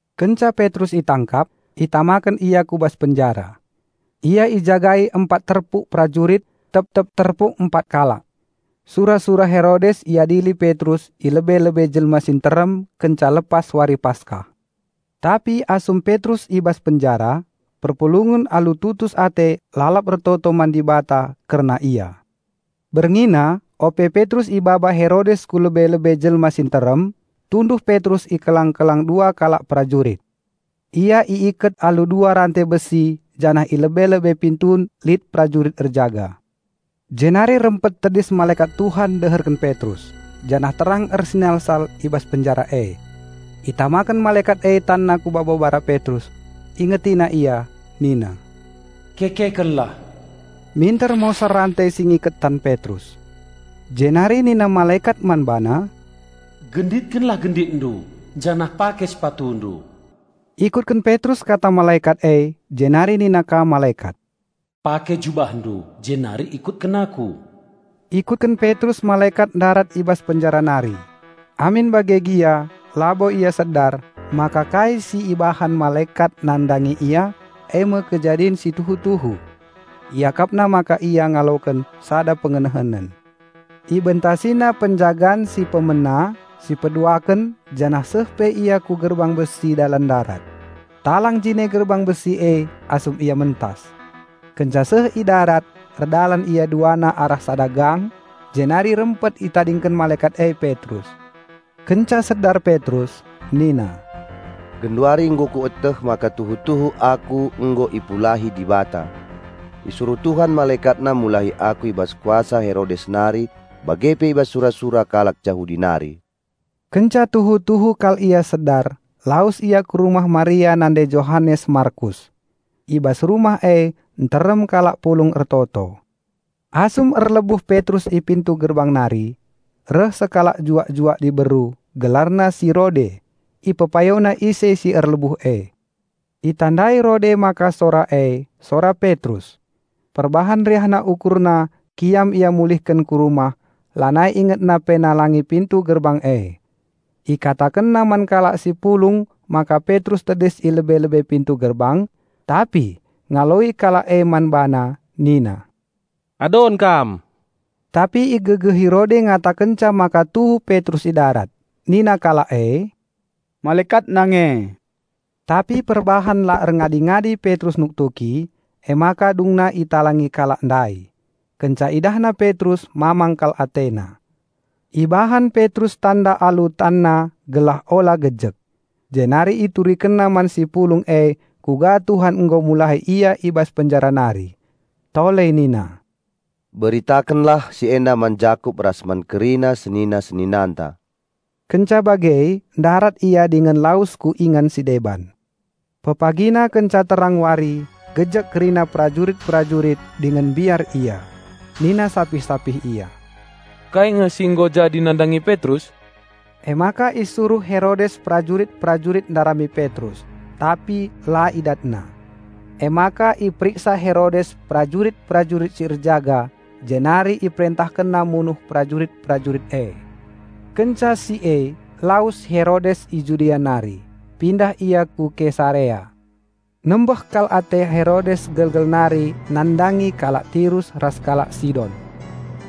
Kenca Petrus itangkap, itamaken ia ku bas penjara. Ia ijagai empat terpuk perajurit; tep-tep terpuk empat kalak. Sura-sura Herodes iadili Petrus i lebe-lebe jelma si nterem kenca lepas wari Paskah. Tapi asum Petrus i bas penjara, perpulungen alu tutus ate lalap ertoto man Dibata kerna ia. Berngina, ope Petrus ibaba Herodes ku lebe-lebe jelma si nterem, tunduh Petrus i kelang-kelang dua kalak perajurit. Ia iiket alu dua rante besi janah i lebe-lebe pintun lit perajurit erjaga. Jenari rempet tedis malekat Tuhan deherken Petrus, janah terang ersinalsal i bas penjara e. Itamaken malekat e tanna ku babo bara Petrus, ingetina ia nina, "Kekekenlah!" Minter mosar rante si ngiket tan Petrus. Jenari nina malekat man bana, "Genditkenlah genditndu janah pake sepatundu!" Ikutken Petrus kata malekat e jenari nina ka malekat, "Pake jubahndu jenari ikutken aku!" Ikutken Petrus malekat ndarat i bas penjara nari. Amin bage gia labo ia sedar maka kai si ibahan malekat nandangi ia, eme kejadin si tuhu-tuhu. Iakapna maka ia ngaloken sada pengenehenen. Ibentasina penjagan si pemena, si peduaken janah seh pe ia ku gerbang besi dalan ndarat. Talang jine gerbang besi e asum ia mentas. Kenca seh i darat erdalan ia duana arah sada gang, jenari rempet itadingken malekat e Petrus. Kenca sedar Petrus nina, "Genduari nggo kueteh maka tuhu-tuhu aku nggo ipulahi Dibata. Isuruh Tuhan MalekatNa mulahi aku i bas kuasa Herodes nari bage pe i bas sura-sura kalak Jahudi nari." Kenca tuhu-tuhu kal ia sedar, lawes ia ku rumah Maria nande Johanes Markus. I bas rumah e nterem kalak pulung ertoto. Asum ituktuk Petrus pintu gerbang reh sekalak juak-juak diberu, gelarna si Rode, guna pepayo ise si nuktuk e. Itandai Rode maka sora e, sora Petrus. Perbahan riahna ukurna kiam ia mulihken ku rumah, lanai ingetna pe nalangi pintu gerbang e. Iberitakenna man kalak si pulung maka Petrus tedis i lebe-lebe pintu gerbang. Tapi ngaloi kalak e man bana nina, "Adon kam." Tapi igegehi Rode ngatakenca maka tuhu Petrus i darat. Nina kalak e, "Malekatna nge." Tapi perbahan la erngadi-ngadi Petrus nuktuki, emaka dungna italangi kalak ndai. Kenca idahna Petrus mamang kal atena. Ibahan Petrus tanda alu tanna gelah ula gejek. Jenari iturikenna man si pulung e kuga Tuhan nggo mulahi ia i bas penjara nari. Tole nina, "Beritakenlah si enda man Jakup ras man kerina senina-seninanta." Kenca bage ndarat ia dingen lawes ku ingan si deban. Pepagina kenca terang wari, gejek kerina perajurit-perajurit dingen mbiar ia. Nina sapih-sapih ia, "Kai nge si nggo jadi nandangi Petrus?" Emaka isuruh Herodes perajurit-perajurit ndarami Petrus, tapi la idatna. Emaka iperiksa Herodes perajurit-perajurit si erjaga jenari iperentahkenna munuh perajurit-perajurit e. Kenca si e lawes Herodes i Judea nari, pindah ia ku Kesarea. Nembeh kal ate Herodes gelgel nari nandangi kalak Tirus ras kalak Sidon.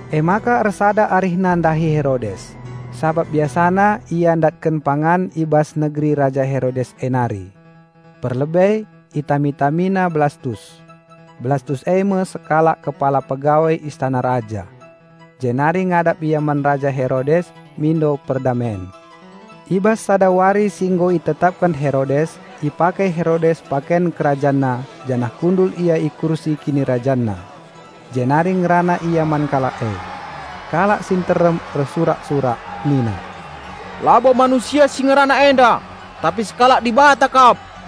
Emaka ersada arihna ndahi Herodes, sabap biasana ia ndatken pangan i bas negeri Raja Herodes e nari. Perlebe itami-tamina Blastus; Blastus eme sekalak kepala pegawai istana raja. Jenari ngadap ia man Raja Herodes mindo perdamen. I bas sada wari si nggo itetapken Herodes, ipake Herodes paken kerajanna janah kundul ia i kursi kinirajanna. Jenari ngerana ia man kalak e. Kalak si nterem ersurak-surak nina, "Labo manusia si ngerana enda, tapi sekalak dibata kap."